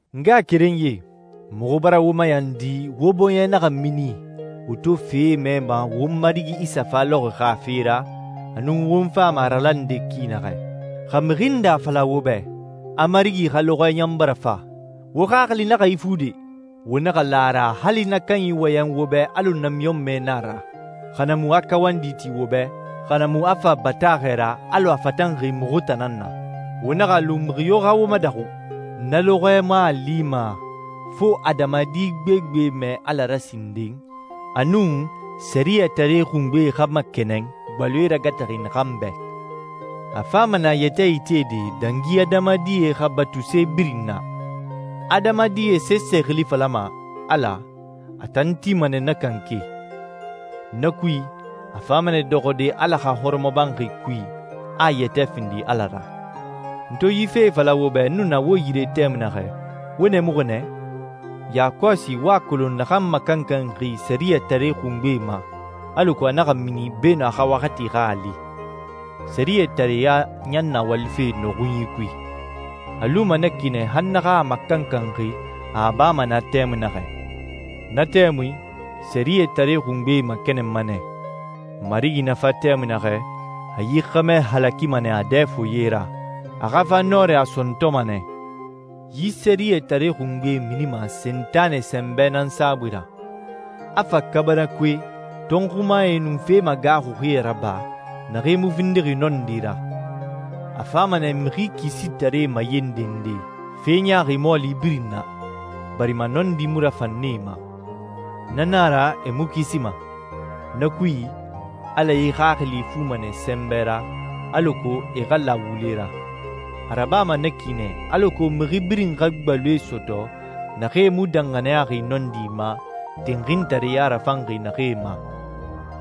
N ngaxakerenyie, muxu bara wo mayandi wo bɔɲɛ naxa mini wo to fee mɛma won Marigi Isa fa lɔxɔɛ xa fe ra, a nun won fama a ralande ki naxɛ. Xa mixi nde a fala wo bɛ a Marigi xa lɔxɔɛ ɲan bara fa, wo xaxili naxa ifu de! Wo naxa la a ra hali na kanyi wɔyɛn wo bɛ alɔ namiɲɔnmɛ na a ra, xa na mu a kawandi ti wo bɛ, xa na mu a fa bataaxɛ ra alɔ a fatanxi muxu tan nan na. Wo naxa a lu mixi yo xa wo madaxu. Na lɔxɔɛ mu a lima fo adamadi gbegbe mɛɛ Ala ra sinden, a nun, Sɛriyɛtare Xungbe, a naxa makɛnɛn, gbaloe ragataxi naxan bɛ. A fama nɛ a yɛtɛ itede dangi adamadie xa batuse birin na. Adamadie sese xili falama «ala», a tan tima nɛ na kanke. Na kui, a fama nɛ dɔxɔde Ala xa hɔrɔmɔbanxi kui, a a yɛtɛ findi ala ra. N to yi fee fala wo bɛ n nu na wo yire tɛmui naxɛ, wo nɛɛmuxi nɛ? Yakɔsi wo a kolon naxan makankanxi Sɛriyɛtare Xungbe ma, alako a naxa mini beenun a xa waxati xa a li. Sɛriyɛtareya ɲan na walife nɔxunyi kui. A luma na ki nɛ han naxan a makankanxi a a bama naa tɛmui naxɛ. Na tɛmui, Sɛriyɛtare Xungbe makɛnɛnma nɛ. Marigi na fa tɛmui naxɛ, a yi xɛmɛ halakima nɛ a dɛ foye ra, a xa fa nɔrɛ a sɔntɔma nɛ. Yi Sɛriyɛtare Xungbe minima Sentanɛ sɛnbɛ nan saabui ra, a fa kaabanakoe, tɔnxumae, nun fe magaaxuxie raba naxee mu findixi nɔndi ra. A fama nɛ mixi kisitaree mayendende fe ɲaaxi mɔɔli birin na, barima nɔndi mu rafan nee ma. Na na a ra e mu kisima. Na kui, Ala e xaxili ifuma nɛ sɛnbɛ ra, alako e xa la wule ra. A rabama na ki nɛ alako mixi birin xa gbaloe sɔtɔ naxee mu danxaniyaxi nɔndi ma, tinxintareya rafanxi naxee ma.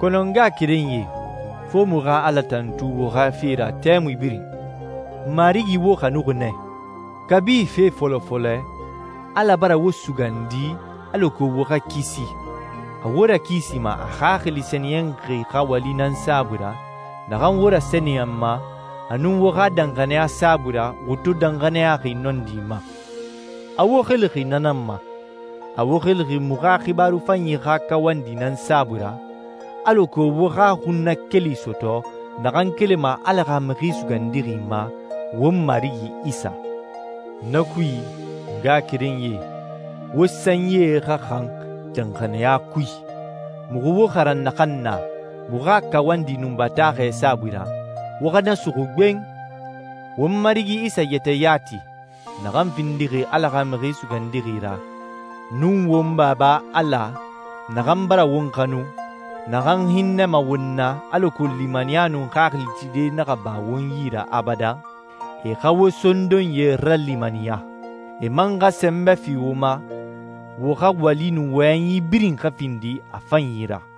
Kɔnɔ n ngaxakerenyie, fo muxu xa Ala tantu wo xa fe ra tɛmui birin. Marigi wo xanuxi nɛ. Kabi fe fɔlɔ fɔlɛ, Ala bara wo sugandi alako wo xa kisi. A wo rakisima a Xaxili Sɛniyɛnxi xa wali nan saabui ra naxan wo rasɛniyɛnma, a nun wo xa danxaniya saabui ra wo to danxaniyaxi nɔndi ma. A wo xilixi na nan ma. A wo xilixi muxu xa xibaaru fanyi xa kawandi nan saabui ra alako wo xa xunnakeli sɔtɔ naxan kelima Ala xa Mixi Sugandixi ma, won Marigi Isa. Na kui, n ngaxakerenyie, wo sanyie xa xan danxaniya kui. Muxu wo xaran naxan na muxu xa kawandi nun bataaxɛ saabui ra, wo xa na suxu gben. Won Marigi Isa yɛtɛ yati, naxan findixi Ala xa Mixi Sugandixi ra, nun won Baba Ala, naxan bara won xanu, naxan hinnɛma won na alako limaniya nun xaxili tide naxa ba won yi ra abadan, e xa wo sondonyie ralimaniya. E man xa sɛnbɛ fi wo ma, wo xa wali nun wɔyɛnyi birin xa findi a fanyi ra.